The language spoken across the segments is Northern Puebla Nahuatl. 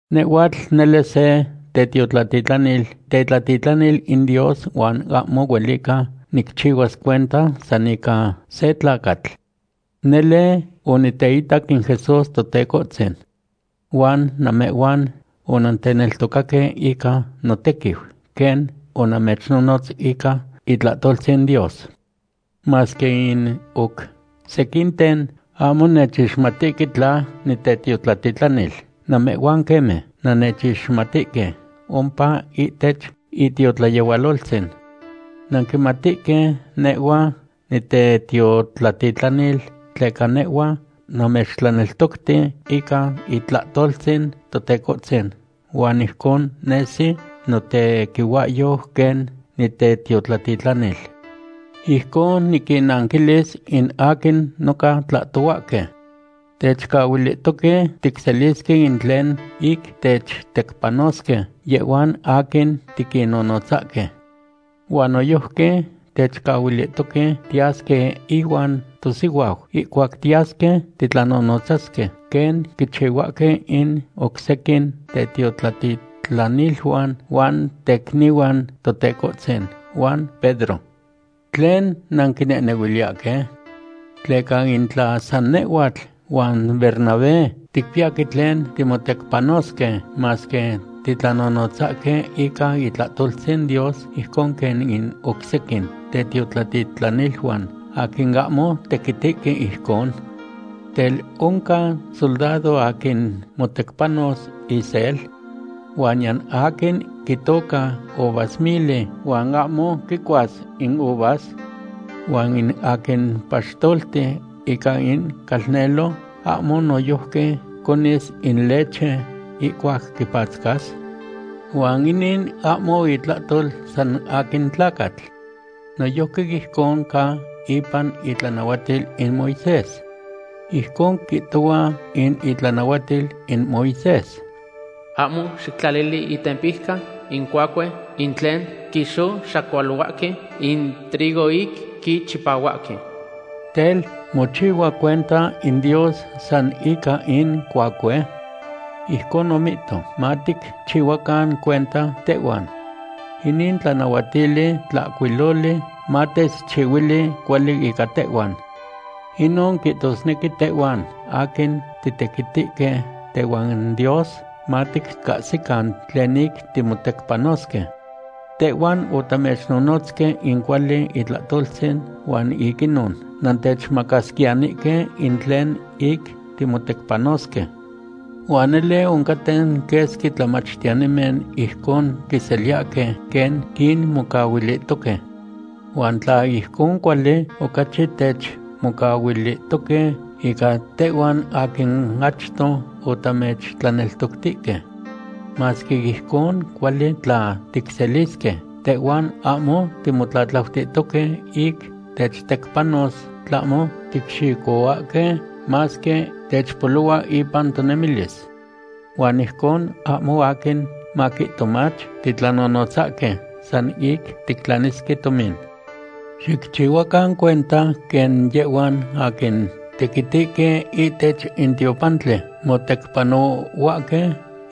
Nehhuatl nele se tetiotlatitlanil, tetlatitlanil in Dios huan ahmo huelica nicchihua cuenta san ica se tlacatl. Nele oniteitac in Jesús Totecohtzin. Huan namehhuan onanteneltocaque ica notequiu quen onamechnonotz ica itlahtoltzin Dios. Masque in oc sequinten ahmo nechixmatihque tla nitetiotlatitlanil, namehhuan queme nannechixmatihque ompa ihtech itiotlayehualoltzin. Nanquimatihque nehhua nitetiotlatitlanil tleca nehhua namechtlaneltocti ica itlahtoltzin Totecohtzin huan ijcon nesi notequihuahyo quen nitetiotlatitlanil. Ijcon niquinnanquilis in aquin noca tlahtohuahque. Techcahuilihtoque ticselisque in tlen ic techtecpanosque yehhuan aquin tiquinnonotzahque. Huan noyojqui techcahuilihtoque tiyasque ihuan tosihuau ihcuac tiyasque titlanonotzasque, quen quichihuahque in oc sequin tetiotlatitlaniluan huan tecnihuan Totecohtzin huan Pedro. ¿Tlen nanquinehnehuiliyahque? ¿Tleca in tla san nehhuatl huan Bernabé ticpiyahque tlen timotecpanosque, masque titlanonotzahque ica itlahtoltzin Dios ijcon quen in oc sequin tetiotlatitlaniluan aquin ahmo tequitihque ijcon? Tel, ¿oncan soldado aquin motecpanos isel? Huan niyan aquin quitoca uvasmili huan ahmo quicuas in uvas. Huan in aquin paxtolti ica in calnelo, ¿ahmo noyojqui conis in leche ihcuac quipatzcas? Huan inin ahmo itlahtol san aquin tlacatl. Noyojqui ijcon ca ipan itlanahuatil in Moisés. Ijcon quihtohua in itlanahuatil in Moisés: “Ahmo xictlalili itempijca in cuacue in tlen quixoxacualohuahque in trigo ic quichipahuahque.” Tel, ¿mochihua cuenta in Dios san ica in cuacue? Ijcon omihto, maticchihuacan cuenta tehhuan. Inin tlanahuatili tlahcuiloli matechchihuili cuali ica tehhuan. Inon quihtosnequi tehhuan aquin titequitihque tehuan Dios maticahsican tlen ic timotecpanosque. Tehhuan otamechnonotzque in cuali itlahtoltzin huan ic inon nantechmacasquiyanihque in tlen ic timotecpanosque. Huan nele oncaten quesqui tlamachtiyanimen ijcon quiseliyahque quen quinmocahuilihtoque. Huan tla ijcon cuali, ocachi techmocahuilihtoque ica tehhuan aquin achto otamechtlaneltoctihque. Masque ijcon cuali tla ticselisque, tehhuan ahmo timotlatlautihtoque ic techtecpanos, tlahmo ticxicohuahque masque techpolohua ipan tonemilis. Huan ijcon ahmo aquin maquihto mach titlanonotzahque san ic tictlanisque tomin. Xicchihuacan cuenta quen yehhuan aquin tequitihque ihtech in tiopantli motecpanohuahque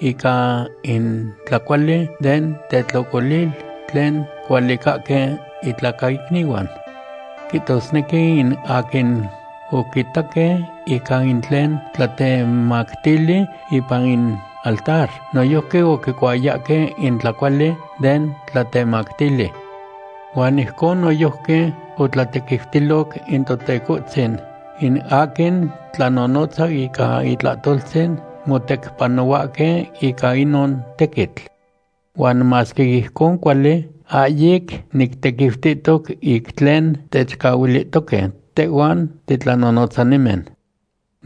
ica in tlacuali den tetlocolil tlen cualicahque intlacaicnihuan. Quihtosnequi in aquin oquitaque ica in tlen tlatemactili ipan in altar, noyojqui oquicuayahque in tlacuali den tlatemactili. Huan ijcon noyojqui otlatequiutiloc in Totecohtzin in aquin tlanonotza ica itlahtoltzin motecpanohuahque ica inon tequitl. Huan masque ijcon cuali, ahyic nictequiutihtoc ic tlen techcahuilihtoque tehhuan titlanonotzanimen.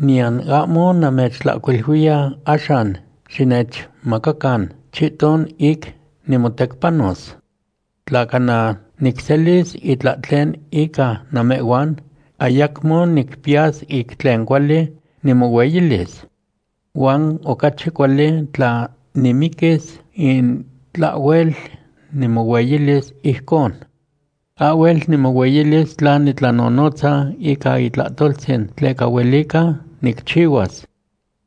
Niyan ahmo namechtlahcuiluiya axan xinechmacacan chihton ic nimotecpanos. Tla cana nicselis itlahtlen ica namehhuan, ayacmo nicpiyas ic tlen cuali nimohueyilis. Huan ocachi cuali tla nimiquis in tlahhuel nimohueyilis ijcon. Ahhuel nimohueyilis tla nitlanonotza ica itlahtoltzin, tleca huelica nicchihuas.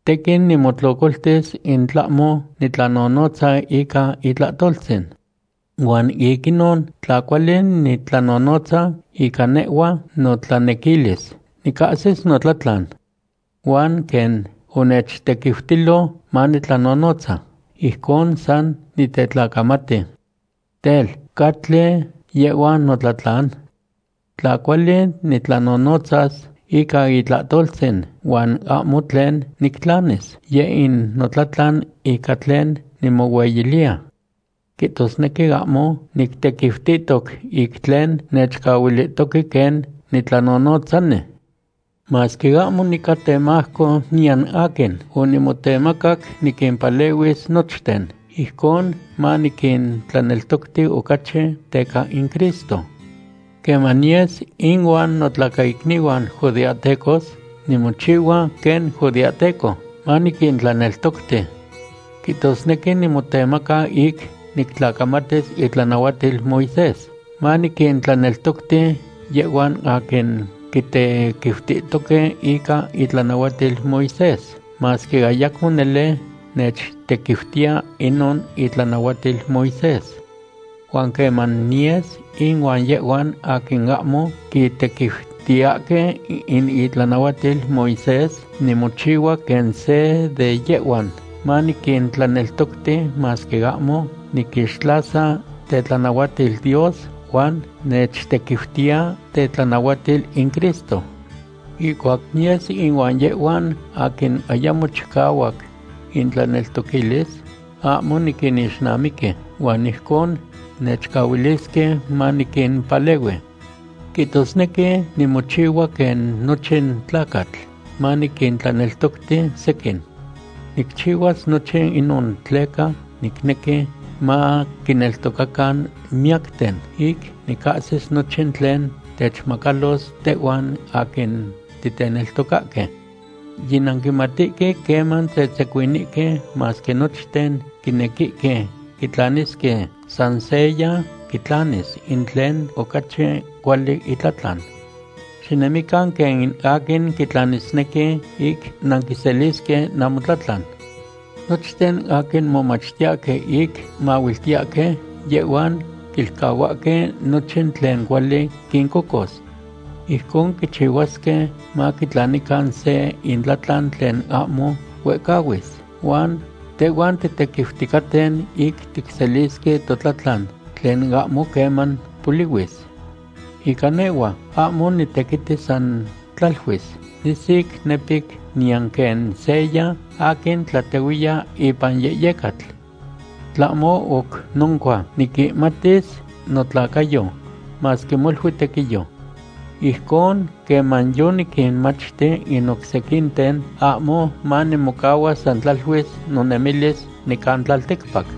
Tequin nimotlocoltis in tlahmo nitlanonotza ica itlahtoltzin. Huan ic inon, tla cuali nitlanonotza ica nehhua notlanequilis, nicahsis notlatlan. Huan quen onechtequiutilo manitlanonotza, ijcon san nitetlacamati. Tel, ¿catli yehhua notlatlan? Tla cuali nitlanonotzas ica itlahtoltzin huan ahmo tlen nictlanis, yeh in notlatlan ica tlen nimohueyiliya. Quihtosnequi ahmo nictequiutihtoc ic tlen nechcahuilihtoque quen nitlanonotzani. Masque ahmo nica temajco niyan aquin, onimotemacac niquimpalehuis nochten, ijcon maniquintlaneltocti ocachi teca in Cristo. Queman niyes inuan notlacaicnihuan judeahtecos, nimochihua quen judeahteco, maniquintlaneltocti. Quihtosnequi nimotemaca ic nictlacamatis itlanahuatil Moisés, maniquintlaneltocti yehhuan aquin quitequiutihtoque ica itlanahuatil Moisés, masque ayacmo nele nechtequiutiya inon itlanahuatil Moisés. Huan queman niyes inuan yehhuan aquin ahmo quitequiutiyahque in itlanahuatil Moisés, nimochihua quen se de yehhuan, maniquintlaneltocti, masque ahmo niquixtlasa tetlanahuatil Dios huan nechtequiutiya tetlanahuatil in Cristo. Ihcuac niyes inuan yehhuan aquin ayamo chicahuac intlaneltoquilis, ahmo niquinixnamiqui huan ijcon nechcahuilisque maniquimpalehui. Quihtosnequi nimochihua quen nochin tlacatl, maniquintlaneltocti sequin. Nicchihuas nochin inon tleca nicnequi maquineltocacan miyacten, ic nicahsis nochin tlen techmacalos tehhuan aquin titeneltocahque. Yinanquimatihque queman tzetzecuinihque, masque nochten quinequihque quitlanisque, san seya quitlanis in tlen ocachi cuali itlatlan. Xinemican quen in aquin quitlanisnequi, ic nanquiselisque namotlatlan. Nochten aquin momachtiyahque ic mahuiltiyahque, yehhuan quilcahuahque nochin tlen cuali quincocos. Ijcon quichihuasque maquitlanican se intlahtlan tlen ahmo huehcahuis, huan tehhuan titequiuticaten ic ticselisque totlatlan tlen ahmo queman polihuis. Ica nehhua, ahmo nitequiti san tlaluis, nisic, nepic; niyan quen seya aquin tlatehuiya ipan yehyecatl. Tlahmo oc noncua, niquihmatis notlacayo, masque molui tequiyo. Ijcon queman yoniquinmachti in oc sequinten, ahmo manimocahua san tlaluis nonemilis nican tlalticpac.